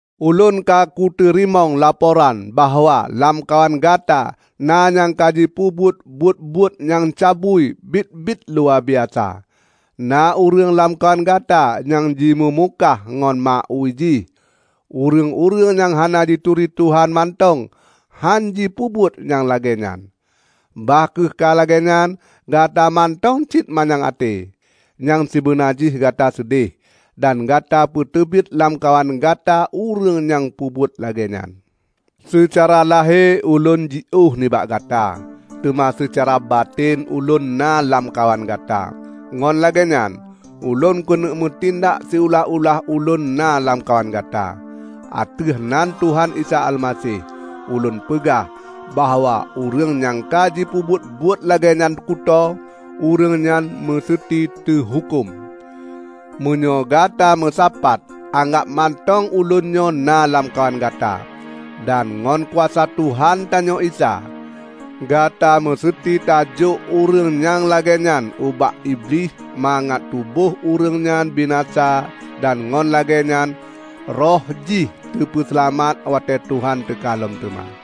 Ulôn ka kuteurimong laporan bahwa lamkawan gata na nyang kajipeubuet buet-buet nyang cabui biet-biet luwabiasa: Na ureuëng lamkawan Gata nyang jimeumukah ngon ma ui jih. Ureuëng-ureuëng nyang hana jituri Tuhan mantong hánjipeubuet nyang lagée nyan! Bah kheueh ka lagée nyan, Gata mantong cit manyang até. Nyang sibeuna jih Gata seudeh, dan Gata peuteubiet lamkawan Gata ureuëng nyang peubuet lagée nyan. Seucara lahé ulôn jiôh nibak gata, teuma seucara baten ulôn na lamkawan gata. Ngon lagée nyan, ulôn keuneuk meutindak siulah-ulah ulôn na lamkawan gata, "Ateueh nan Tuhan Isa Almaseh, ulôn peugah bahwa ureuëng nyangka jipeubuet buet lagée nyan kutoe, ureuëng nyan meuseuti teuhuköm!" Meunyoe gata meusapat anggab mantong ulôn nyoe na lamkawan gata, dan ngon kuasa Tuhan tanyoe Isa, gata meuseuti tajôk ureuëng nyang lagée nyan ubak Iblih mangat tuboh ureuëng nyan binasa dan ngon lagée nyan roh jih teupeuseulamat watée Tuhan teuka lom teuma.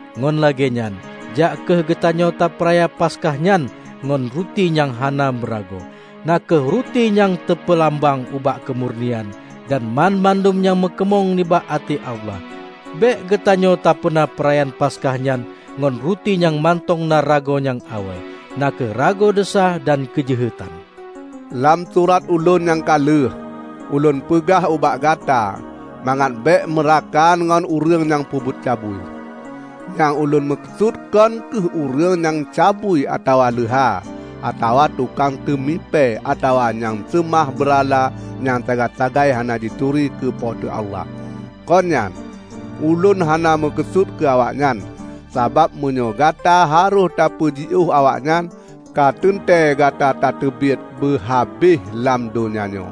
Ngon lagée nyan, jak kheueh geutanyoe tapeuraya Paskah nyan ngon ruti nyang hana meuragoe, na kheueh ruti nyang teupeulambang ubak keumurnian dan banmandum nyang meukeunong nibak até Allah. Bék geutanyoe tapeuna peurayaan Paskah nyan ngon ruti nyang mantong na rago nyang awai, na kheueh rago desya dan keujeuhetan. Lam surat ulôn nyang ka lheueh, ulôn peugah ubak gata mangat bék meurakan ngon ureuëng nyang peubuet cabui. Nyang ulôn meukeusut kon kheueh ureuëng nyang cabui atawa leuha, atawa tukang teumipée atawa nyang seumah beurala nyang sagai-sagai hana jituri keu Po teu Allah. Kon nyan! Ulôn hana meukeusut keu awaknyan; sabab meunyoe gata harôh tapeujiôh awaknyan, ka teuntée gata tateubiet beuhabéh lam donya nyoe.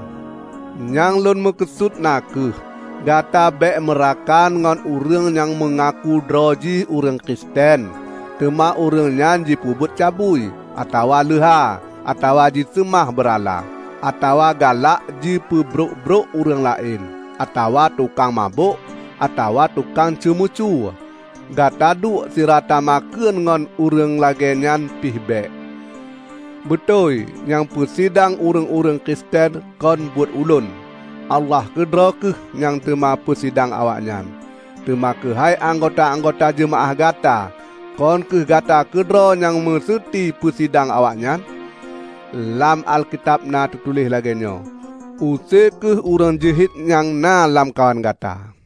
Nyang lôn meukeusut na kheueh, gata bék meurakan ngon ureuëng nyang meungaku droe jih ureuëng Kristen, teuma ureuëng nyan jipeubuet cabui, atawa leuha, atawa jiseumah beurala, atawa galak jipeubrok-brok ureuëng laén, atawa tukang mabök, atawa tukang ceumeucue. Gata duek sira tamakheun ngon ureuëng lagée nyan pih bék! Beutôi nyang peusidang ureuëng-ureuëng Kristen kon buet ulôn. Allah keudroe kheueh nyang teuma peusidang awaknyan. Teuma keuhai anggota-anggota jeumaáh gata, kon kheueh gata keudroe nyang meuseuti peusidang awaknyan? Lam Alkitab na teutuléh lagée nyoe, "Use kheueh ureuëng jeuhet nyang na lamkawan gata."